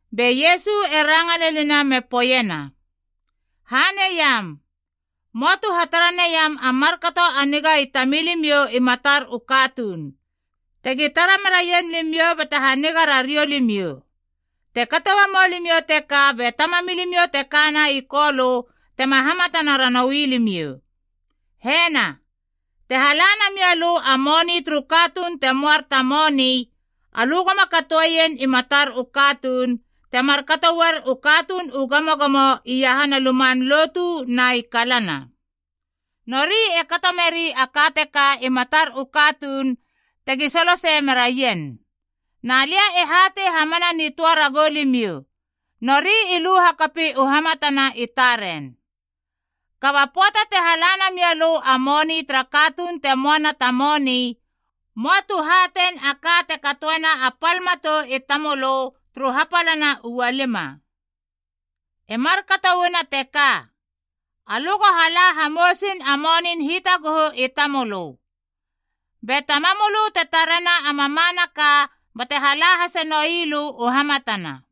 Be Iesu e ranga lenina me poeiena, “Haneiam, möa tu hatara naiam a markato a niga i tamilimiou i matar u katuun, tegi tara meraien limiou bate haniga rariou limiou. Te kato uamou limiou teka be Tamamilimiou te kana i Kolö tema hamatana ranoui limiou. “Hena, te hala namia lö a moni turu katuun te moar ta moni, alö goma katoeien i matar u katuun, te markato uar u katuun u gamogamo iahana luman lotu na i kalana. Nori e kato meri a ka teka i matar u katuun tegi solosei meraien. Na lia e hatei hamana nitöa ragou limiou, nori i lu hakapi u hamatana i taren. Kaba pöata te hala namia lö a moni tara katuun te moana ta moni, möa tu hatein a ka te katoena a pal matou i tamölö turu hapalana u ualima. E markato uana teka, alö go hala hamousin a monin hitaguhu i tamölö. Be Tamamölö te tarena a mamanaka, bate hala hasenoi lö u hamatana.”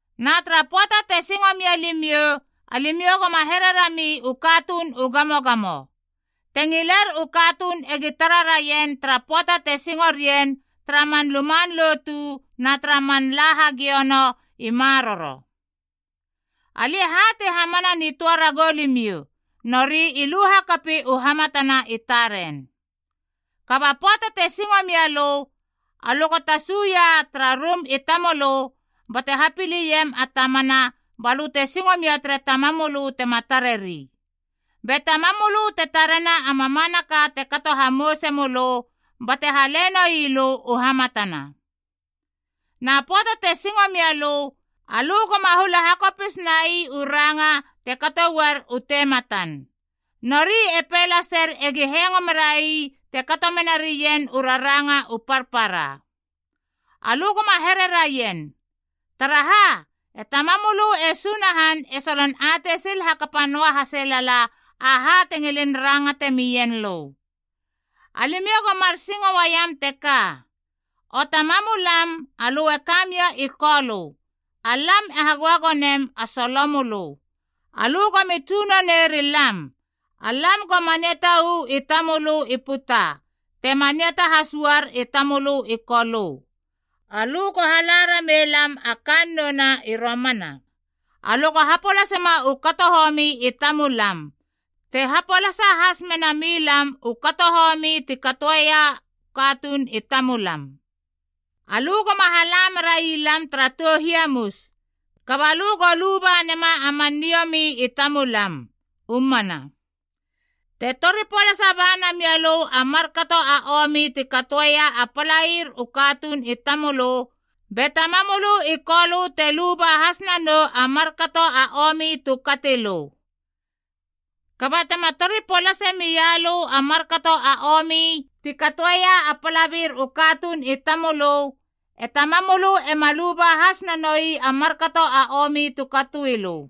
“Na tara pöata te singo mia limiou, alimiou goma hererami u katuun u gamogamo. Te ngiler u katuun egi tara raien tara pöata te singo rien tara man luman lotu na tara man la hagiono i maroro. Alia e hatei hamana nitöa ragou limiou, nori i lu hakapi u hamatana i taren. Kaba pöata te singo mia lö, alö go tasuia tara rum i tamölö bate hapiliem a tamana balö te singo mia tere Tamamölö tema tareri. Be Tamamölö te tarena a mamanaka te kato hamouse mölö, bate hale noilö u hamatana. “Na pöata te singo mia lö, alö goma hula hakopis nai u ranga te kato uar u tematan. Nori e pei laser egi hengo merai te kato menarien u raranga u parpara. Alö goma here raien, taraha e Tamamölö e Sunahan e solon atei sil hakapa noa haselala aha te ngilin rangate mien lö. “Alimiou go mar singo uaiam teka: ‘O Tamamulam alö e kamia i Kolö, alam e hagöagonem a solomölö. Alö gomi tsunone rilam. Alam go maniata uu i tamölö i puta te maniata has uar i tamölö i Kolö. Alö go hala rameilam a kannou na i romana. Alö go hapolasema u kato homi i tamulam te hapolasa has menamilam u kato homi ti katoeia u katuun i tamulam. Alö goma hala merai lam tara tou hiamus, kaba lö go luba nema a man niomi i tamulam. U mana.’ “Te tori polasa ba namia lö a markato a omi ti katoeia a palair u katuun i tamölö, be Tamamölö i Kolö te luba has nanou a markato a omi tu kati lö. Kaba tema tori polasei mia lö a markato a omi ti katoeia a palair u katuun i tamölö, e Tamamölö ema luba has nanoi a markato a omi tu katoi lö.”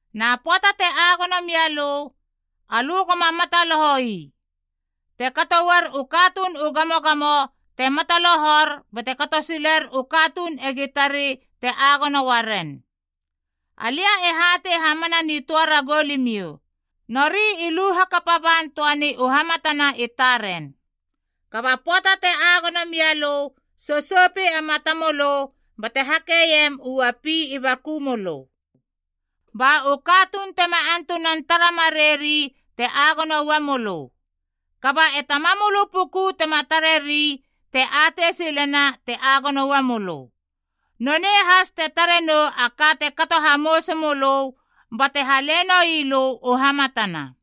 “Na pöata te agono mialö, alö goma mataloho ii. Te kato uar u katuun u gamogamo te matalohor bate kato siler u katuun egi tari te agono uaren. Alia e hatei hamana nitöa ragou limiou, nori i lu hakapa ban töani u hamatana i taren. Kaba pöata te agono mialö, sousoupi a mata mölö bate hakeiem u uapi i baku mölö. Ba u katuun tema antunan tara marei ri te agono uamölö. Kaba e Tamamölö puku tema tareri te atei silena te agono uamölö. Nonei has te tarenou a ka te kato hamouse mölö bate hale noilö u hamatana.”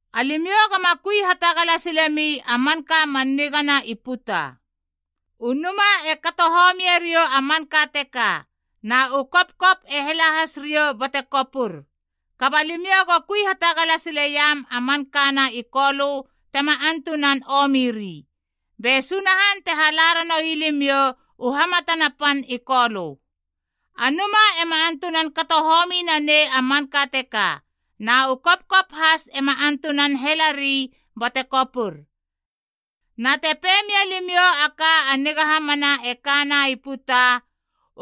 “Alimiou goma kui hatagala silemi a manka a man nigana i puta. U numa e kato homieriou a manka teka, na u kopkop e hela has riou bate kopur. Kaba limiou go kui hatagala sileiam a mankana i Kolö tema antunan omiri. Be Sunahan te hala ranoui limiou u hamatana pan i Kolö. A numa ema antunan kato homi nanei a manka teka, na u kopkop has ema antunan helari bate kopur. Na, te pei mia limiou a ka a niga hamana e kana i puta,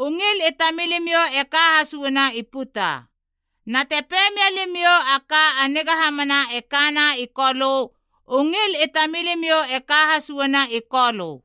u ngil i tamilimiou e ka has uana i puta. Na te pei mia limiou a ka a niga hamana e kana i Kolö, u ngil i tamilimiou e ka has uana i Kolö.”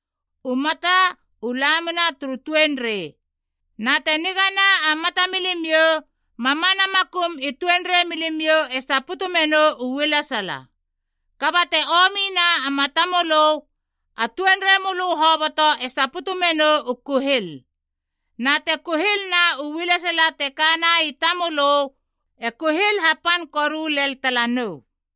“U mata, u lamina turu tuenrei. Na te nigana a mata milimiou, mamana makum i tuenrei milimiou e saputu menou u ualesala. Kaba te omina a mata mölö, a tuenrei mölö hoboto e saputu menou u kuhil. Na te kuhilna u alesala te kana i tamölö, e kuhil hapan koru len talanou.”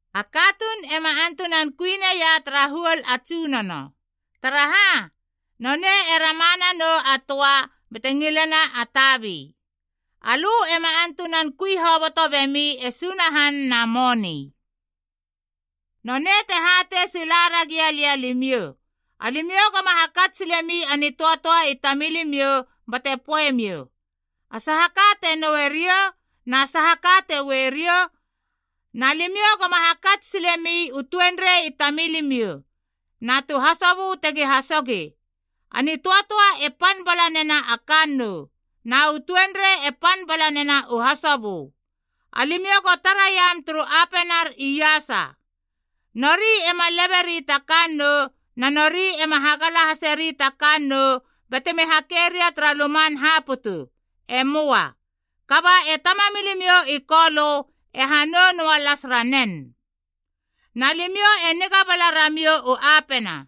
“A katuun ema antunan kui neia tara huol a tsunono. Taraha, nonei e rama nanou a töa bate ngilena a tabi. Alö ema antunan kui hoboto bemi e Sunahan na moni. “Nonei te hatei sila ragia lia limiou: alimiou goma hakats silemi a nitöatöa i tamilimiou bate poe miou, ‘A saha ka te noue riou? Na saha ka te ue riou?’ Na limiou goma hakats silemi u tuenrei i tamilimiou, na tu hasobö tegi hasogi. A nitöatöa e pan bala nena a kannou, na u tuenrei e pan bala nena u hasobu. Alimiou go taraiam turu apenar iasa. Nori ema leberi ta kannou na nori ema hagala haseri ta kannou batemi hakeria tara luman haputu. E möa. Kaba e Tamamilimiou i Kolö e hanou noa las ranen. Na limiou e niga bala ramiou u apena.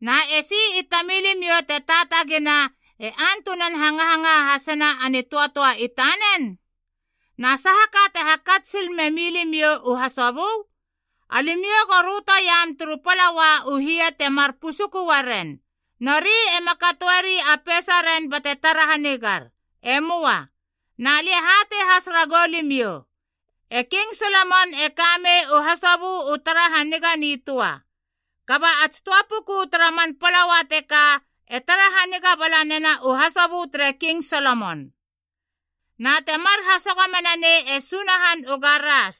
Na esi i tamilimiou te taatagina e antunan hangahangaha hasena a nitöatöa i tanen? “Na saha ka te hakats sil me milimiou u hasobö? Alimiou go rötoiam turu palaua u hie temar pusuku uaren. Nori ema katoeri a peisaren bate tara hanigar. E möa. Na lia e hatei has ragou limiou, e King Solomon e kamei u hasobö u tara haniga nitöa, kaba a tsi töa puku tara man palaua teka e tara haniga bala nena u hasobö tere King Solomon. Na temar hasogo menanei e Sunahan u garas,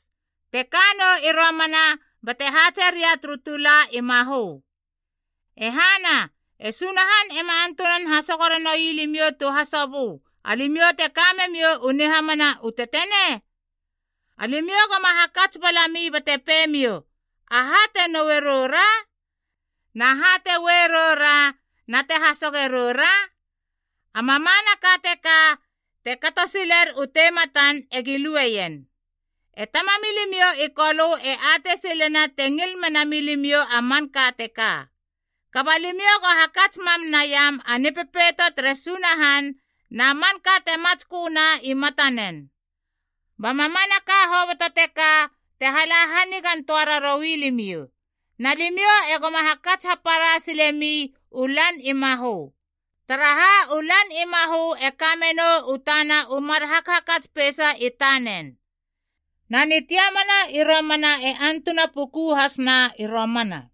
te ka nou i romana bate haatse ria turu tula i mahö. E hana, e Sunahan ema antunan hasogo ranoui limiou tu hasobö, alimiou te ka memiou u nihamana u tetenei? Alimiou goma hakats balami bate peimiou, ‘Aha te noue rou ra? Na ha te ue rou ra na te hasoge rou ra?’ A mamanaka teka te kato siler u tematan egi lueien. E Tamamilimiou i Kolö e atei silena te ngil mena milimiou a manka teka. Kaba limiou go hakats mam naiam a Nipepeito tere Sunahan na manka te matsköna i matanen. Ba mamanaka hoboto teka, te hala hanigan töa raroui limiou. Na limiou egoma hakats hapara sile mi u lan i mahö, taraha u lan i mahö e ka menou u tana u mar hakhakats peisa i tanen. Na nitiamana i romana e antuna puku hasna i romana.”